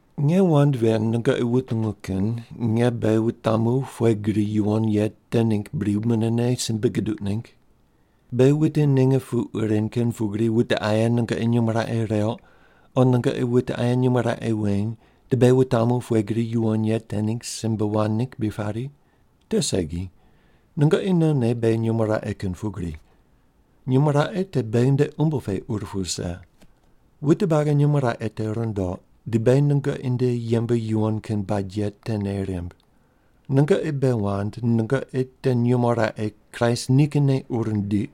Nge wand ven nungoqi wutungu kin nge beghi wutamu pughe gri yuwon ye te ningg bri munene simbe guduq ningg? Beghi wute ninge puq ren kin pugri wute aye nungoqi nyumo raqe reuq o nungoqi wute aye nyumo raqe weny di beghi wutamu pughe gri yuwon ye te ningg simbe wand ningg bri pari? Te segi. Nungoqi nonne beghi nyumo raqe kin pugri. Nyumo raqe te beghi nde umbo pe ur pu wuse. Wute buagi nyumo raqe te rundoq di beghi nungoqi nde yembe yuwon kin bad ye te nei rimb. Nungoqi bei wand nungoqi te nyumo raqe Kraist nikinne ur nindiq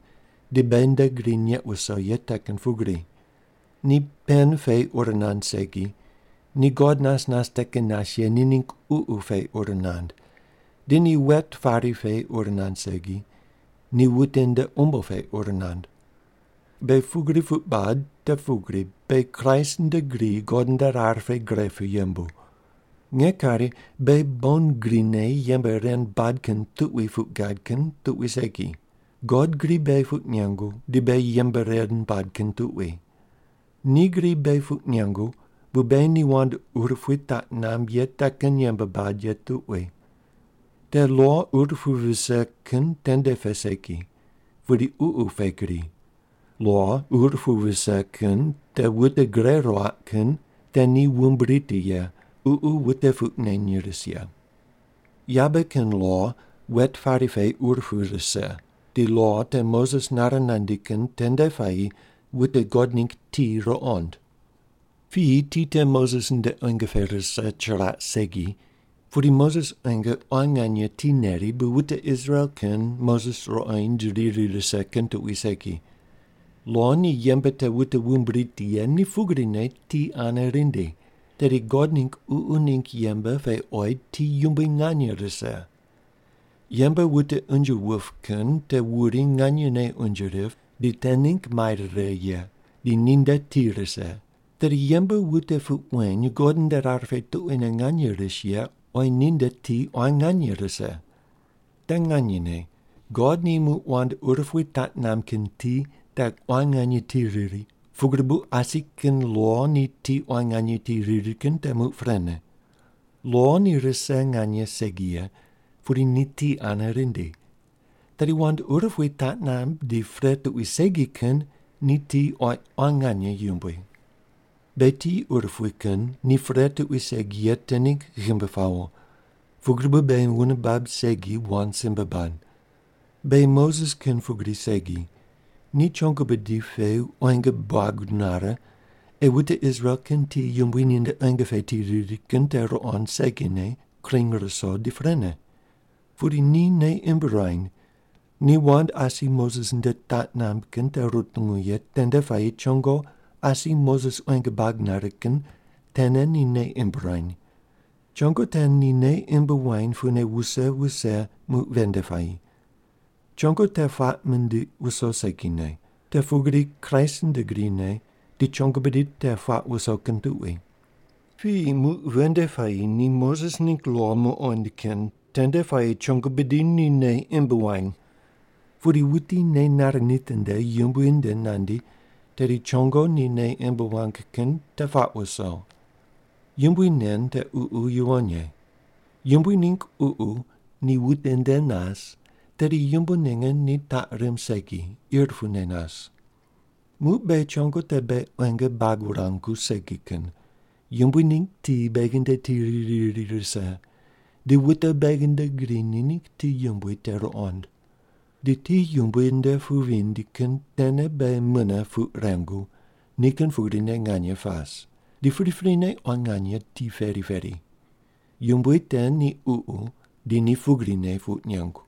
di beghi nde gri neq wuso ye te kin pugri. Ni pen pe ur nand segi, ni God nas nas te kin nas ye ni ningg Ququ pe ur nand, di ni wet pari pe ur nand segi, ni wute nde umbo pe ur nand. Beghi pugri puq bad te pugri beghi Kraist nde gri God nde rar pe gre pu yembu. Nge kari beghi bon grine yembe ren bad kin tuqui puq gad kin tuqui segi, God gri beghi puq nengu di beghi yembe ren bad kin tuqui. Ni gri beghi puq nengu bu beghi ni wand urupui taq namb ye te kin yembe bad ye tuqui. Te lo ur pu vise kin tende pe segi, pudi Ququ pe gri. Lo ur pu vise kin te wute gure ruaq kin te ni wumb riti ye, Ququ wute puq neny ris ye. Yabe kin lo wet pari pe ur pu rise, di lo te Moses nare nandi kin tende puayi wute God ningg ti ruqond. Piyi ti te Moses nde quenge pe rise chiraq segi, pudi Moses quenge quan nganye ti neri bu wute Israel kin Moses ruqoind riri rise kin tuqui segi. Lo ni yembe te wute wumb riti ye ni pugrine ti ane rindi, tedi God ningg Ququ ningg yembe pe oyi ti yumbui nganye rise. Yembe wute unje wup kin te wuri nganyene unje rip di te ningg mai rire ye, di ninde ti rise, tedi yembe wute puq weny God nde rar pe tuquine nganye ris ye oyi ninde ti quan nganye rise. Te nganyene God ni muq wand urupui taq namb kin ti te quan nganye ti riri pugri bu asi kin lo ni ti quan nganye ti riri kin te muq prene. Lo ni rise nganye segi ye pudi ni ti ane rindi, tedi wand urupui taq namb di pre tuqui segi kin ni ti oyi quan nganye yumbui. Beghi ti urupui kin ni pre tuqui segi ye te ningg ghimbi pawo, pugri bu beghi wune bab segi wand simbe bad. Beghi Moses kin pugri segi, ni chongo bidi pe quenge buag nare ei wute Israel kin ti yumbui ninde quenge pe ti riri kin te ruqond segine kring ruso di prene. Pudi ni nei imb ruany, ni wand asi Moses nde taq namb kin te rutungu ye tende puayi chongo asi Moses quenge buag nare kin tene ni nei imb ruany. Chongo te ni nei imb wany pune wuse wuse muq ven nde puayi. Chongo te puaq mindiq wuso segine, te pugri Kraist nde grine di chongo bidi te puaq wuso kin tuqui. Piyi muq ven nde puayi ni Moses ningg lo muqond kin tende puayi chongo bidi ni nei imb wany. Pudi wuti nei nare nitinde Yumbui nde nandi tedi chongo ni nei imb wang kin te puaq wuso. Yumbui nen te Ququ Yuwon Ye. Yumbui ningg Ququ ni wuti nde nas tedi yumbo ninge ni taq rimb segi, ir pune nas. Muq beghi chongo te beghi quenge buag wurangu segi kin, Yumbui ningg ti beghi nde ti riri riri rise, di wute beghi nde gri ni ningg ti yumbui te ruqond. Di ti Yumbui nde pu vindi kin tene beghi mune puq rengu ni kin pugrine nganye pas, di priprine quan nganye ti peri peri. Yumbui te ni Ququ di ni pugrine puq nengu.